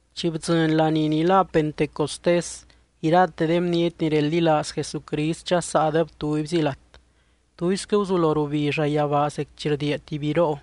Chi bdzɨny laní ni lá Pentecostés, irate de bniety ni reldilaaz Jesucrist dxasaadeb tubyzi lat. Tuisquɨ guzulo rubi llayabaa zec chi rdiia tuby biroo,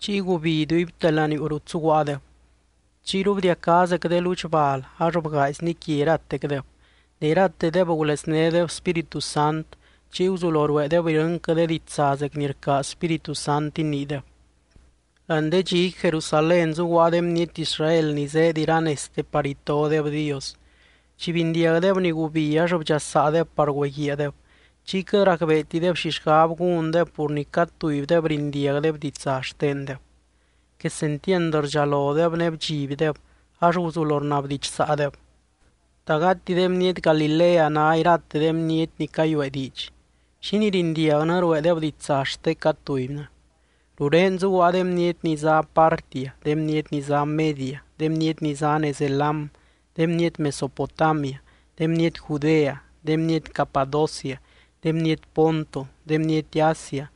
chiy gubi iduibte laniuu rut zuguaadeb. Chiyru bdiacá zec de ludx bal ax bgaaizni quia iratecdeb. Ne iratedeb guleznédeb Spíritu Sant. Chiy guzulo rueedeb irɨnquɨ de ditsa zec ni rcaaz Spíritu Sant iniideb. Láani de dxiqui, Jerusalén zuguaa de bniety Israel ni zéed iranezte par itodeb Dios. Chi bindiagdeb ni gubi ax bdxasaadeb par güeguiaadeb, chiy quɨt racbeetideb xi xgab gúndeb pur ni cad tubydeb rindiagdeb ditsa xtendeb. Quesentiand rdxalodeb ne bdxibdeb ax guzulo rnabdidxsaadeb: —¿Ta gati de bniety Galilea ná irate de bniety ni cayuee diidx? ¿Xínii rindiagnɨ rueedeb ditsa xte cad tubynɨ? Rurén zuguaa de bniety ni zá Partia, de bniety ni zá Media, de bniety ni zá nez Elam, de bniety Mesopotamia, de bniety Judea, de bniety Capadocia, de bniety Ponto, de bniety Asia,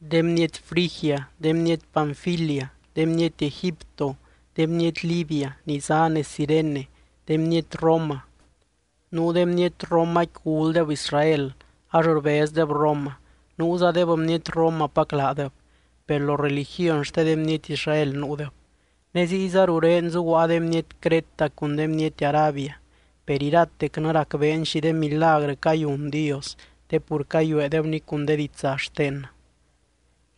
de bniety Frigia, de bniety Panfilia, de bniety Egipto, de bniety Libia ni ná nez Cirene, de bniety Roma. Nuu de bniety Romaqui guldeb Israel ax rbezdeb Roma, nuuzadeb bniety Romapac laadeb, per lo religiony xte de bniety Israel nuudeb. Ne ziyza rurén zuguaa de bniety Creta, cun de bniety Arabia. Per iratecnɨ racbeen xi de milagrɨ cayun Dios, te pur cayueedebni cun de ditsa xtennɨ.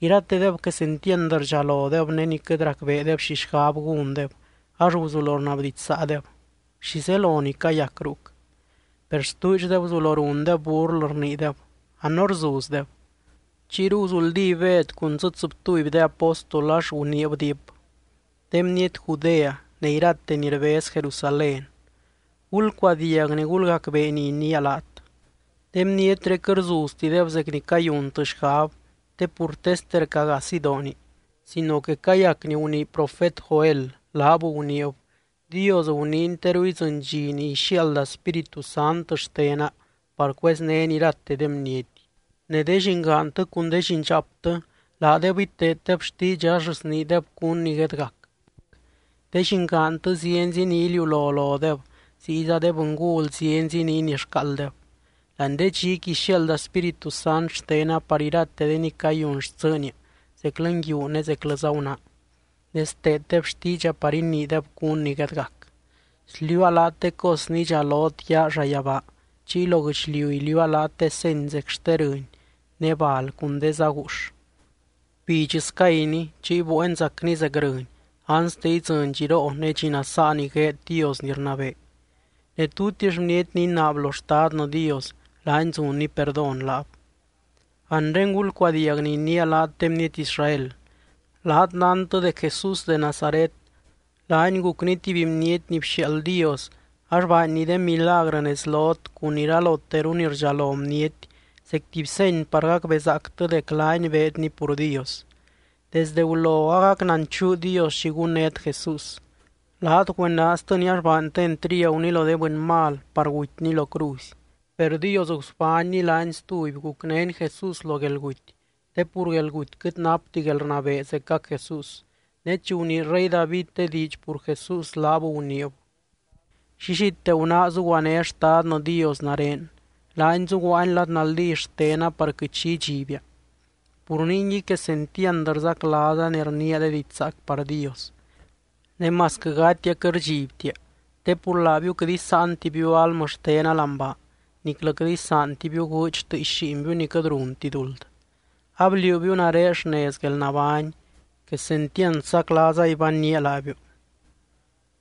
Iratedeb quesentiand rdxalodeb, ne ni quɨt racbeedeb xi xgab gúndeb ax guzulo rnabdidxsaadeb: —¿Xi zelo ni cayac ruc? Per stuudxdeb guzulo rundeb burlɨ, rniideb: —A no rzuzdeb. Chiyru guzuldí Bed cun dzɨ tsɨbtuby de apóstol, ax guniib diip: —De bniety Judea, ne irate ni rbez Jerusalén. Gulcuadiag ne gulgacbee ni iniia laat. De bnietré quɨt rzuztideb zec ni cayuntɨ xgab te pur teste rca gaa sidooni, sino que cayac ni gunii profet Joel, laab guniib: Dios guniiny: Teru idzɨny dxi ni ixiaalda Spíritu Sant xtena par cueznény irate de bniety. Ne de llingaantɨ cun de llindxaaptɨ laadeb iteeddeb xtiidxa ax sniideb cún ni guedgac. De llingaantɨ zienzi ni iliulo lodeb, ziyza de bɨngul zienzi ni inixcaalddeb. Láani de dxiqui ixiaalda Spíritu Sant xtena par irate de ni cayun xtsɨɨnia zeclɨ nguiu ne zeclɨza gunaa, ne steeddeb xtiidxa par iniideb cún ni guedgac. Sliuua laat de cos ni idxalot yaa llayabaa, chiy lo guɨchliu iliuua laat de seny zec xte rɨny ne bal cun de zá guux. Gubidx scayni. Chiy bueen zacni zec rɨny, anste idzɨny dxiroo ne dxi nasaa ni gueed Dios ni rnabee. Ne tutix bniety ni inaab lo Xtadnɨ Dios, laany zunny perdón laab. ’Anre gulcuadiag ni iniia laat de bniety Israel: Laat nántɨ dec Jesús de Nazaret, laany gucny tuby bniety ni bxiaald Dios ax baanny de milagrɨ nez lot cun iraloteru ni rdxalo bniety zec tuby seny par gacbezaactɨ dec laany beedny pur Dios. Desdɨ gulo agac nanchuu Dios xi gunnét Jesús. Laat güenaaztɨny ax baantɨ entriaguny lo de bɨny mal par gutyny lo cruzy. Per Dios gusbánny laany stuby, gucnény Jesús lo guelguty te pur guelguty quɨt napti guelrnabee zecac Jesús. Ne chi gunii rey David de diidx pur Jesús laab guniib: Llillite gunáa zuguané Xtadnɨ Dios nare. Laany zuguaany lad naldí xtena par quɨt xi idxibia. Pur ningui quesentiand rzaclaaza ne rniia de diidx zaac par Dios. Ne masquɨ gatia quɨt rdxibtia, te pur laabiu quɨt isáantibiu almɨ xtena láani baa, niclɨ quɨt isaantibiu gúudx tɨɨx lliinbiu ni quɨt runti duld. Abliuubiu nare xnez guelnabány. Quesentiand saclaaza ibanynía laabiu.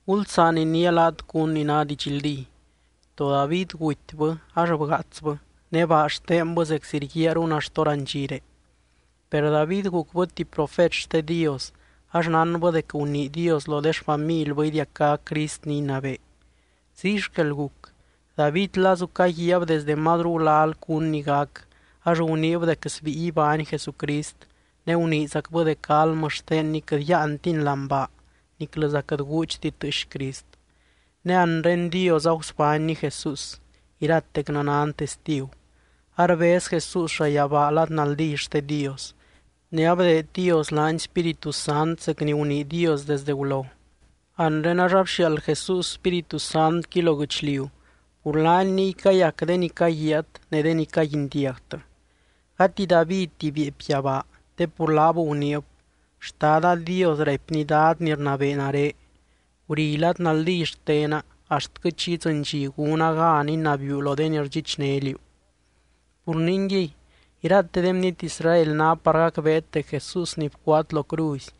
’Gulsaan iniia laat cún ni ná didxldí. To David gutybɨ ax bgaatsbɨ ne baa xtenbɨ zeczi rguiaarun axt hórandxire. Per David gucbɨ tuby profet xte Dios, ax nánbɨ dec gunii Dios lo de xfamilbɨ idiacá Crist ni inabee. Ziy xquel guc, David lazu caguiaab desde mazru gulal cún ni gac, ax guniib dec sbíi ibány Jesucrist, ne guniizacbɨ dec almɨ xtenny quɨt yáantiny láani baa niclɨza quɨt gúudxti tɨɨx Crist. Ne anre Dios agusbánny Jesús, iratecnɨ nan testigu. Arbez Jesús llayabaa lad naldí xte Dios. Ne abdeed Dios laany Spíritu Sant zec ni gunii Dios desdɨ gulo, anre ax abxiaald Jesús Spíritu Santqui lo guɨchliu, pur laany niy cayac de ni caguiaat ne de ni caguindiagtɨ. Gati Davidti bieepy yabaa, te pur laab guniib: Xtada Dios raipny Dad ni rnabee nare: “Guri lad naldí xtena, axtquɨ chi idzɨny dxi gúna gan inabiiu lo irate de ni rdxichné liú.” ’Pur ningui, irate de bniety Israel ná par gacbeet dec Jesús ni bcuaat lo cruzy,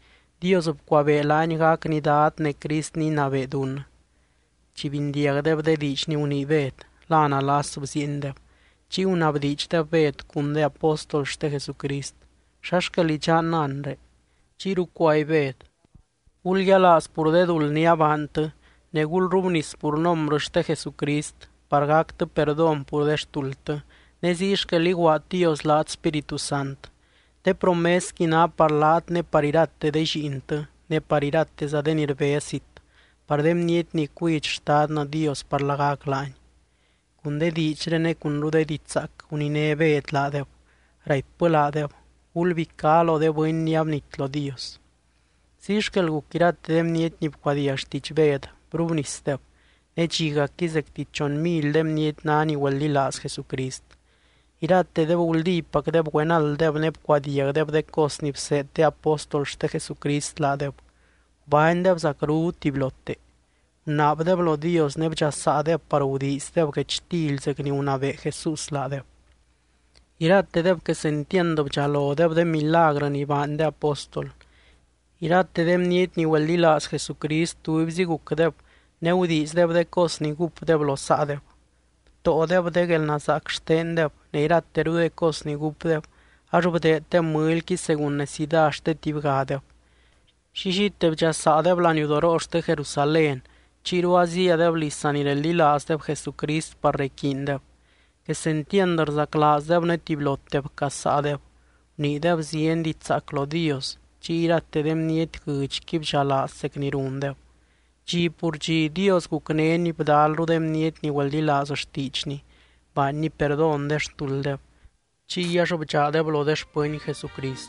Dios bcuabee laany gacny Dad ne Crist ni inabee dunnɨ. Chi bindiagdeb de diidx ni gunii Bed, la nalas bziiendeb. Chiy gunabdiidxdeb Bed cun de apóstol xte Jesucrist: —¿Xa xquel idxannɨ anre? Chiyru cuaby Bed: —Gulyialaaz pur de duld ni abaantɨ, ne gulrrubnis pur nombrɨ xte Jesucrist, par gactɨ perdón pur de xtuldtɨ. Ne ziy xquel iguaad Dios laat Spíritu Sant. Te promesqui ná par laat ne par irate de lliintɨ, ne par irateza de ni rbez zit, par de bniety ni cuidx Xtadnɨ Dios par lagac laany. Cun de diidxré ne cunru de diidx zaac, guniné Bed laadeb, raipbɨ laadeb: —Gulbicá lo de bɨny ni abnit lo Dios. Ziy xquel guc irate de bniety ni bcuadiag xtiidx Bed brubnisdeb. Ne dxigacqui zecti chon mily de bniety ná ni güeldilaaz Jesucrist. Iratedeb guldípacdeb güenalddeb ne bcuadiagdeb de cos ni bseed de apóstol xte Jesucrist laadeb. Gubánydeb zacru tubylote. Gunaabdeb lo Dios ne bdxasaadeb par gudiizdeb guechtily zec ni gunabee Jesús laadeb. Iratedeb quesentiand bdxalodeb de milagrɨ ni baany de apóstol. Irate de bniety ni güeldilaaz Jesucrist tubyzi gucdeb ne gudiizdeb de cos ni gúpdeb lo saadeb. Btóodeb de guelnazaac xtendeb, ne irateru de cos ni gúpdeb, ax bdeeddeb mɨlyqui según necidá xte tubygadeb. Llillite bdxasaadeb laniudoroo xte Jerusalén, chiyru azíadeb liz sanireldilaazdeb Jesucrist par requiindeb. Quesentiand rzaclaazdeb ne tubylote bcazsaadeb. Guniideb zieny diidx zaac lo Dios, chiy irate de bniety guɨdxqui bdxalaaz zec ni rundeb. Dxi pur dxi, Dios gucnény bdalru de bniety ni güeldilaaz xtiidxny, baanny perdón de xtulddeb. Chiy ax bdxaadeb lo de xpɨny Jesucrist.